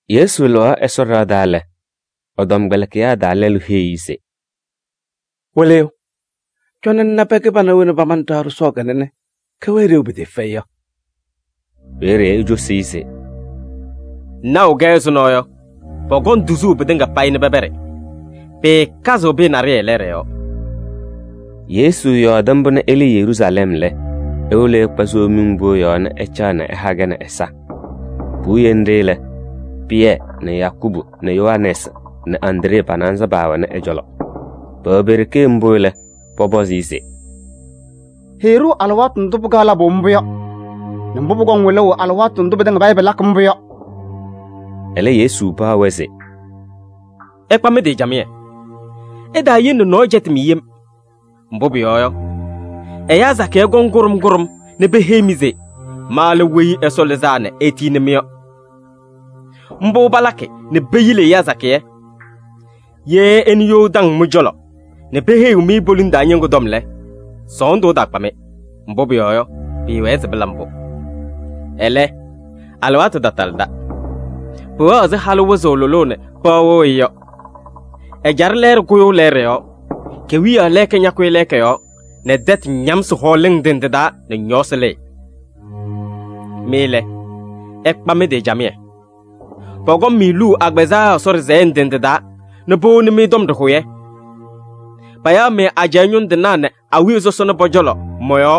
Yesu lɩɣaɣ Ɛsɔ ɖɩɣa taa lɛ, ɛ-tɔmkpɛlɩkɩyaa taa lɛlʋ heyi-i se: “Wɩlɩyʋ, cɔnɩ ŋna pɛɛ kɩbana wena pamanɩ ɖɩɣa sɔsɔɔ kanɛ nɛ kɛwɛɛ ɖeu pɩtɩɩfɛyɩ yɔ.” Peeye ecosi-i se: “Ŋnaɣʋ-kɛ ɛzʋnɔ yɔ, pɔkɔŋ tuzuu pɩtɩŋa payɩ nɛ pɛpɛɖɩ. Pɩɩkazɩɣ pɩyɛ naɖɩyɛ lɛɛɖɛ yɔɔ.” Yesu yɔɔdɩ mbʋ nɛ ɛlɩɩ Yeruusalɛm lɛ, ewolo ɛkpa Somiŋ Pʋʋ yɔɔ nɛ ɛcaɣ nɛ ɛha-kɛ nɛ ɛza. Puwiye nɖɩ lɛ, Pɩyɛ nɛ Yakubu nɛ Yohanɛɛsɩ nɛ Andree pa-naanza paawɛnɩ ɛ-cɔlɔ. Pɛwɛ pe-ɖeke mbʋ lɛ, pɔpɔzɩ-ɩ se: “Heyi-ɖʋ alɩwaatʋ ndʋ pɩkaɣ labʋ mbʋ yɔ nɛ mbʋ pʋkɔŋ wɩlʋʋ alɩwaatʋ ndʋ pɩtɩŋa payɩ pɩlakɩ mbʋ yɔ.” Ɛlɛ, Yesu paɣ-wɛ se: “Ɩkpa mɩ-tɩ camɩyɛ, ɩtaayele nɛ nɔɔyʋ cɛtɩ-mɩ yem. Mbʋ pʋyɔɔ yɔ, ɛyaa sakɩyɛ kɔŋ kʋɖʋm kʋɖʋm nɛ peheyi-mɩ se: ‘Ma lɛ Weyi Ɛsɔ Lɩzaa nɛ etiyini-mɩ’ yɔ: mbʋ palakɩ nɛ peyili ɛyaa sakɩyɛ. Ye ɩnɩ you taŋ mɩ-cɔlɔ nɛ peheyiɣ-mɩ poliŋ taa ñɩŋgʋ tɔm lɛ, sɔɔndʋ ɛtaakpa-mɩ. Mbʋ pʋyɔɔ yɔ, pʋwɛɛ se pɩla mbʋ. Ɛlɛ, alɩwaatʋ tatalɩda. Pʋwɛɣ ɛzɩ halʋ wɩzʋʋ lʋlʋʋ nɛ pɩɣa wɩɣ-ɩ yɔ. Ɛjaɖɛ lɛɛɖɛ kʋyʋʋ lɛɛɖɛ yɔɔ, kewiyaɣ lɛɛka ñakʋyɩ lɛɛka yɔɔ nɛ tɛtʋ ñamsɩ hɔɔlɩŋ ndɩ ndɩ taa nɛ ñɔɔsɩ lɩɩ. “Mɩ lɛ, ɩkpa mɩ-tɩ camɩyɛ. Pɔkɔŋ-mɩ luu agbazɛɛ Ɛsɔ ɖɩsɛyɛ ndɩ ndɩ taa nɛ powoni-mɩ tɔm ɖɩhʋyɛ. Payaɣ-mɩ ajɛɛ ñʋŋ tɩnaa nɛ awiya sɔsɔna pɔ-cɔlɔ mɔ-yɔɔ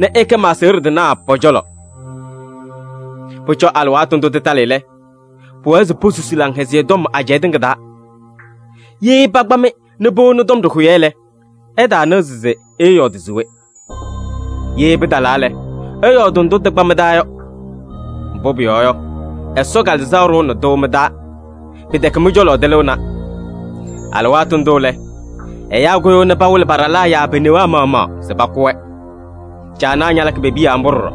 nɛ ɩkɛ ma-aseɣɖe tɩnaa pɔ-cɔlɔ. Pʋcɔ alɩwaatʋ ndʋ tɩtalɩ lɛ, pʋwɛɛ se posusi Laŋhɛzɩyɛ Tɔm ajɛɛ tɩŋa taa. Ye pakpa-mɩ nɛ powoni tɔm ɖɩhʋyɛ lɛ, ɩtaanɩɣzɩ se ɩɩyɔɔdɩ se we. Ye pɩtalaa lɛ, ɩyɔɔdɩ ndʋ tɩkpa mɩ-taa yɔ. Mbʋ pʋyɔɔ yɔ, Ɛsɔ Kalɩzaɣ ɖʋʋnɩ-tʋ mɩ-taa, pɩtɛkɛ mɩ-cɔlɔ tɩlɩɣna. Alɩwaatʋ ndʋ lɛ, ɛyaa kʋyʋʋ nɛ pawɩlɩ pa-ɖalaa yaa pe-newaa maɣmaɣ se pakʋ-wɛ. Caanaa ñalakɩ pe-piya mbʋ ɖɔɖɔ.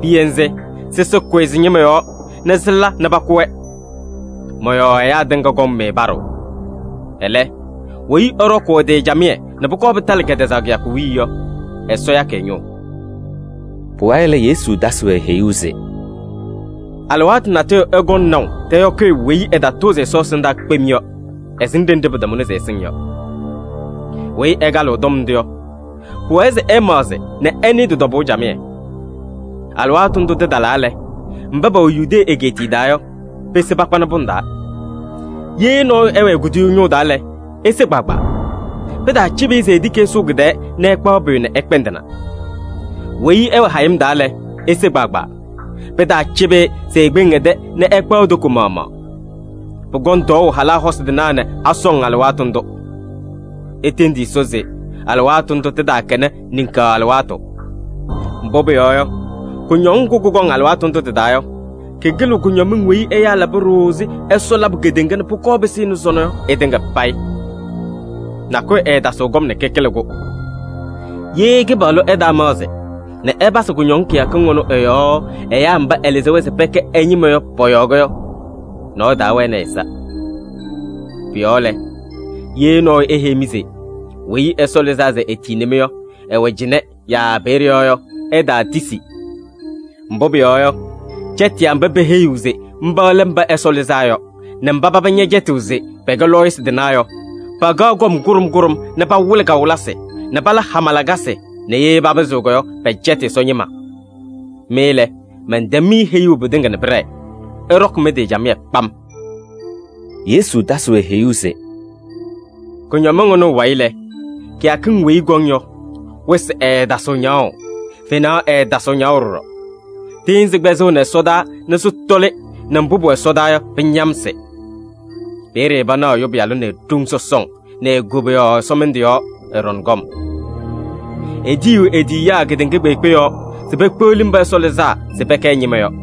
Piya nzɩ, sɩsɩ kʋyɩ sɩ-ñɩma yɔɔ nɛ sɩla nɛ pakʋ-wɛ. Mɔ-yɔɔ ɛyaa tɩŋa kɔŋ-mɩ paɖʋʋ. Ɛlɛ, weyi ɛɖɔkʋʋ ɛ-tɩ camɩyɛ nɛ pʋkɔɔ pɩtalɩ kɛtɛzaɣ kɩyakʋ wiye yɔ, Ɛsɔ yakɩ ɛ-ñʋʋ.” Pʋwayɩ lɛ, Yesu tasɩ-wɛ heyuu se: “Alɩwaatʋ natʋyʋ ɩkɔŋ naʋ tɛyɔkɩyʋ weyi ɛtatʋʋzɩ Ɛsɔ ɛsɩndaa kpem yɔ, ɛsɩŋ ɖenɖe pɩtamʋnɩ se ɛsɩŋ yɔ. Weyi ɛkalɩɣ tɔm ndʋ yɔ, pʋwɛɛ se ɛmaɣzɩ nɛ ɛnɩɩ tɩ-tɔbʋʋ camɩyɛ. Alɩwaatʋ ndʋ tɩtalaa lɛ, mba pɛwɛ Yudee egeetiye taa yɔ, pese pakpanɩ pʋŋ taa. Ye nɔɔyʋ ɛwɛ e-kuduyuu ñʋʋ taa lɛ, ese kpaagbaa. Pɩtaacɩbɩ-ɩ se etiki ɛsʋʋ kɩ-tɛɛ nɛ ɛkpaɣ pʋyʋ nɛ ɛkpɛndɩna. Weyi ɛwɛ hayɩm taa lɛ, ese kpaagbaa. Pɩtaacɩbɩ-ɩ se ekpeŋ ɛ-tɛ nɛ ɛkpaɣ e-toko maɣmaɣ. Pʋkɔŋ tɔɔʋ halaa hosi tɩnaa nɛ asɔŋ alɩwaatʋ ndʋ. Itendi Ɛsɔ se alɩwaatʋ ndʋ tɩtaakɛnɩ niŋkaɣ alɩwaatʋ. Mbʋ pʋyɔɔ yɔ, kʋñɔŋ ŋgʋ kʋkɔŋ alɩwaatʋ ndʋ tɩ-taa yɔ, kɩkɩlɩɣ kʋñɔmɩŋ weyi ɛyaa laba ɖooo ɛzɩ Ɛsɔ labʋ kedeŋa nɛ pʋkɔɔ pɩsɩnɩ sɔnɔ yɔ ɩtɩŋa payɩ. Nakʋyʋ ɛɛtasɩɣ kɔm nɛ kɩkɩlɩ-kʋ. Ye Kɩpaɣlʋ ɛtaamaɣzɩ nɛ ɛpasɩ kʋñɔŋ kɩyakɩŋ ɩnʋ ɩ-yɔɔ ɛyaa mba ɛlɩzɩ-wɛ se pɛkɛ ɛ-ñɩma yɔ pɔ-yɔɔ yɔ, nɔɔyʋ taawɛnɩ ɛ-ɛza. “Pʋ-yɔɔ lɛ, ye nɔɔyʋ eheyi-mɩ se Weyi Ɛsɔ Lɩzaa nɛ etiyini-mɩ yɔ, ɛwɛ cɩnɛ yaa peeye yɔ yɔ, ɩtaatisi. Mbʋ pʋyɔɔ yɔ, cɛtɩyaa mba peheyiɣ se mba lɛ Mba Ɛsɔ Lɩzaa Yɔ nɛ mba paba ñɛcɛtɩɣ se pɛkɛ lɔɔyɩsɩ tɩnaa yɔ, pakaɣ kɔm kʋɖʋm kʋɖʋm nɛ pawɩlɩ kawɩlɩsɩ nɛ pala hama lakasɩ nɛ ye papɩzɩɣ yɔ, pɛcɛtɩ Ɛsɔ ñɩma. Mɩ lɛ, mɛntɛm-mɩ heyuu pɩtɩŋa nɛ pɩɖɛɛ. Ɩɖɔkɩ mɩ-tɩ camɩyɛ kpam.” Yesu tasɩ-wɛ heyuu se: “Kʋñɔmɩŋ ɩnʋ ɩ-wayɩ lɛ, kɩyakɩŋ weyi ɩkɔŋ yɔ, wɩsɩ ɛɛtasɩɣ ñaɣʋ, fenaɣ ɛɛtasɩɣ ñaɣʋ ɖɔɖɔ. Tɩɩnzɩ kpɛzɩɣnɩ ɛsɔdaa nɛ sɩtɔlɩ nɛ mbʋ pʋwɛ ɛsɔdaa yɔ, pɩñamsɩ. Peeye panaɣ Ɛyʋ Pɩyalʋ nɛ e-ɖoŋ sɔsɔŋ nɛ e-koboyaɣ ɛsɔmɩndʋ yɔɔ, ɛɖɔŋ kɔm. Etiyiɣ e-tiyiyaa kedeŋa kpeekpe yɔɔ se pekpeɣli mba Ɛsɔ lɩzaa se pɛkɛ ɛ-ñɩma yɔ.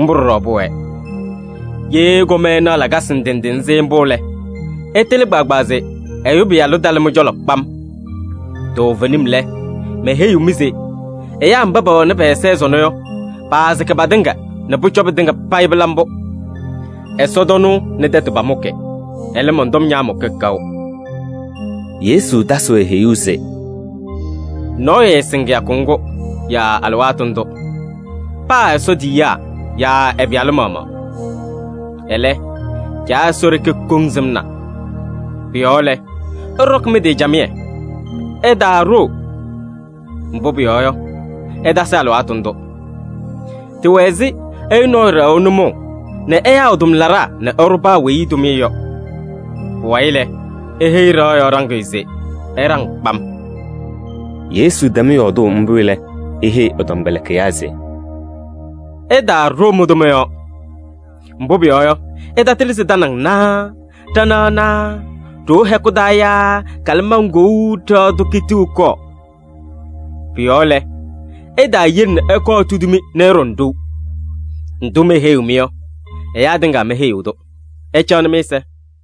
Mbʋ ɖɔɖɔ pʋwɛɛ. Ye ɩkɔm ɩnaɣ lakasɩ ndɩ ndɩ nzɩ mbʋ lɛ, ɩtɩlɩ kpaagbaa se Ɛyʋ Pɩyalʋ talɩ mɩ-cɔlɔ kpam. Toovenim lɛ, meheyiɣ-mɩ se: ɛyaa mba pɛwɛnɩ pɛ-ɛza ɛzʋnɔ yɔ, paasɩkɩ patɩŋa nɛ pʋcɔ pɩtɩŋa payɩ pɩla mbʋ. Ɛsɔtɔnʋʋ nɛ tɛtʋ pamʋkɩ, ɛlɛ, mɔn-tɔm ñaamʋkɩ kaʋ.” Yesu tasɩ-wɛ heyuu se: “Nɔɔyʋ ɛɛsɩŋ kɩyakʋ ŋgʋ yaa alɩwaatʋ ndʋ. Paa Ɛsɔ tiyiyaa yaa ɛ-Pɩyalʋ maɣmaɣ. Ɛlɛ, Caa Ɛsɔ ɖeke koŋ sɩmna. Pʋ-yɔɔ lɛ, ɩɖɔkɩ mɩ-tɩ camɩyɛ, ɩtaaɖoo. Mbʋ pʋyɔɔ yɔ, ɩtasɩ alɩwaatʋ ndʋ. Tɩwɛ ɛzɩ ɛyʋ nɔɔyʋ ɖɛɣʋ nʋmɔʋ nɛ ɛyaa ɛ-tʋmlaɖaa nɛ ɛɖʋ paa weyi tʋmɩyɛ yɔ. Pʋwayɩ lɛ, eheyi ɖɩɣa yɔɔ ɖaŋɩyʋ se ɛɖaŋ kpam.” Yesu tɛm yɔɔdʋʋ mbʋ lɛ, eheyi ɛ-tɔmkpɛlɩkɩyaa se: “Ɩtaaɖoo mɩ-tʋma yɔɔ. Mbʋ pʋyɔɔ yɔ, ɩtatɩlɩ se tanaŋ naa ɖanaɣ naa ɖoo hɛkʋ taa yaa kalɩmaŋ kou ɖɩɣa tʋ kitiɣ ɛkɔɔ. Pʋ-yɔɔ lɛ, ɩtaayele nɛ ɛkɔɔ etudi-mɩ nɛ ɩɖɔŋ ɖou. Ndʋ meheyiɣ-mɩ yɔ, ɛyaa tɩŋa meheyiɣ-tʋ. Ɩcaɣnɩ mɩ-ɛza.”